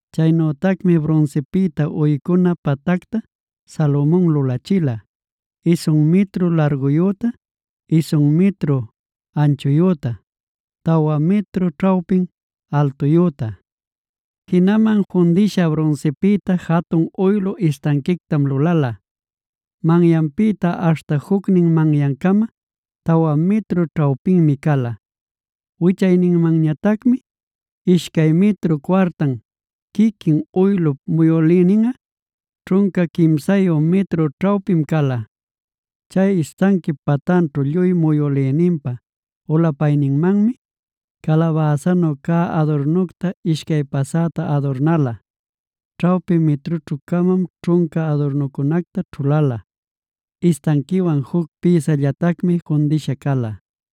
Chaynütacmi brunsipïta uycuna patactaa Salomon lulachila, isun mitru larguyüta, isun mitru anchuyüta, tawa mitru ćhawpin altuyüta. Jinaman fundïsha brunsipïta jatun uylu istanquictam lulala: manyanpïta aśhta jucnin manyancama tawa mitru ćhawpinmi cala. Wichayninmanñatacmi ishcay mitru cuartan; quiquin uylup muyülïninꞌa ćhunca quimsayu mitru ćhawpim cala. Chay istanquip patanćhu lluy muyülïninpa ulapayninmanmi, calabäsanu cä adurnucta ishcay pasäta adurnäla. Ćhawpi mitrućhu-camam ćhunca adurnucunacta ćhulala; istanquiwan juc pïsallatacmi fundïsha cala.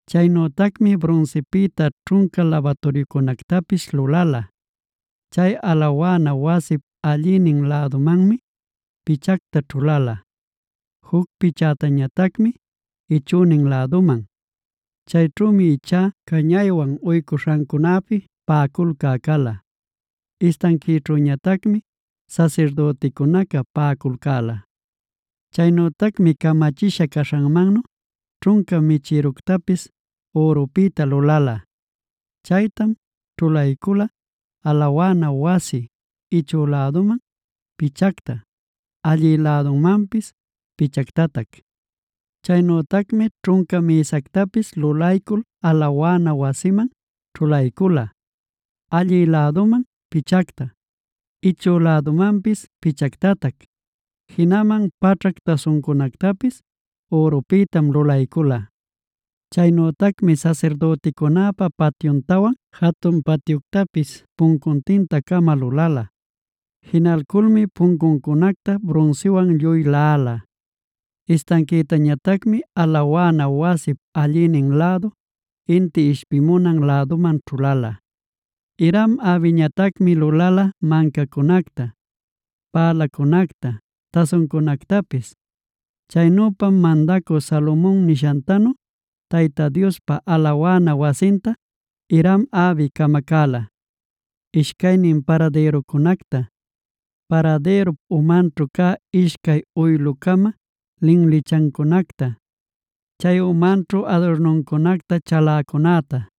Chaynütacmi brunsipïta ćhunca labaturyucunactapis lulala;b chay alawana wasip allïnin lädumanmi pichacta ćhulala, juc pichätañatacmi ichünin läduman. Chayćhümi ichá cañaywan uycuśhancunäpi paꞌaculcä cala. Istanquićhüñatacmi sasirdüticunaca paꞌaculcäla. Chaynütacmi camachisha caśhanmannu ćhunca michïructapis ürupïta lulala.c Chaytam ćhulaycula alawana wasip ichü lädunman pichacta, allï lädunmanpis pichactatac. Chaynütacmi ćhunca mïsactapisd lulaycul alawana wasiman ćhulaycula, allï läduman pichacta, ichü lädumanpis pichactatac. Jinaman paćhac tasuncunactapis ürupïtam lulaycula. Chaynütacmi sasirdüticunäpa patyuntawan jatun patyuctapis puncuntinta-cama lulala. Jinalculmi puncuncunacta brunsiwan lluy laꞌala. Istanquïtañatacmi alawana wasip allïnin lädu, inti ishpimunan läduman ćhulala. Hiram-abiñatacmi lulala mancacunacta, pälacunacta, tasuncunactapis. Chaynüpam mandacü Salomon nishantanu Tayta Diospa alawana wasinta Hiram-abi camacäla: Ishcaynin paradïruncunacta, paradïrup umanćhu cä ishcay uylu-cama linlichancunacta, chay umanćhu adurnuncunacta chaläcunäta,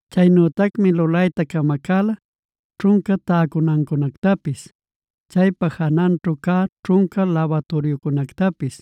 Chaynütacmi lulayta camacäla: ćhunca täcunancunactapis, chaypa jananćhu cä ćhunca labaturyucunätapis,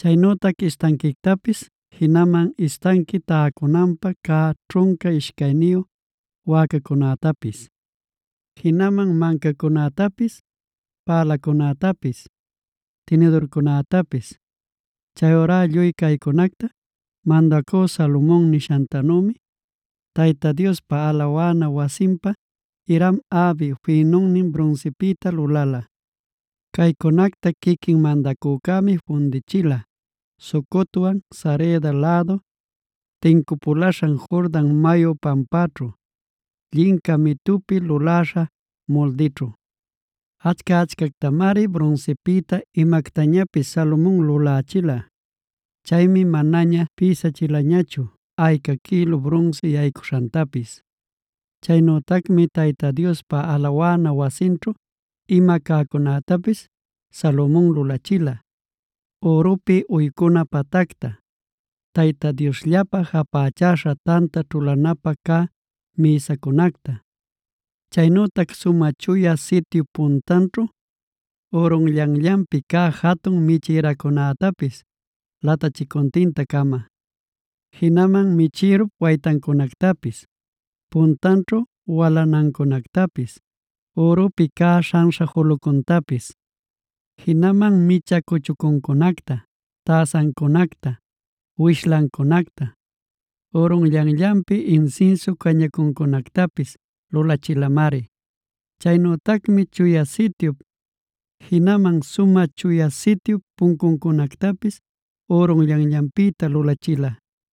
chaynütac istanquictapis, jinaman istanqui taycunanpä cä ćhunca ishcayniyu wäcacunätapis, jinaman mancacunätapis, pälacunätapis, tinidurcunätapis. Chayurá lluy caycunacta mandacü Salomon nishantanümi, Tayta Diospa alawana wasinpä Hiram-abi fïnunnin brunsipïta lulala. Caycunacta quiquin mandacücämi fundichila Sucotwan Sareda lädu tincupulaśhan Jordan mayu pampaćhu, llinca mitupi luläśha muldićhu. Achca-achcactamari brunsipïta imactañapis Salomon lulächila. Chaymi manaña pïsachilañachu ayca quïlu brunsi yaycuśhantapis. Chaynütacmi Tayta Diospa alawana wasinćhu ima cäcunätapis Salomon lulachila: ürupi uycuna patacta, Tayta Diosllapä japächaśha tanta ćhulanapä cä mïsacunacta, chaynütac Sumä Chuya Sityup puntanćhu ürunllanllanpi cä jatun michïracunätapis latachicuntinta-cama, jinaman michïrup waytancunactapis, puntanćhu walanancunactapis, ürupi cä śhanśha julucuntapis. Jinaman micha cuchucuncunacta, täsancunacta, wishlancunacta, ürunllanllanpi insinsiu cañacuncunactapis lulachilamari. Chaynütacmi Chuya Sityup, jinaman Sumä Chuya Sityup puncuncunactapis ürunllanllanpïta lulachila.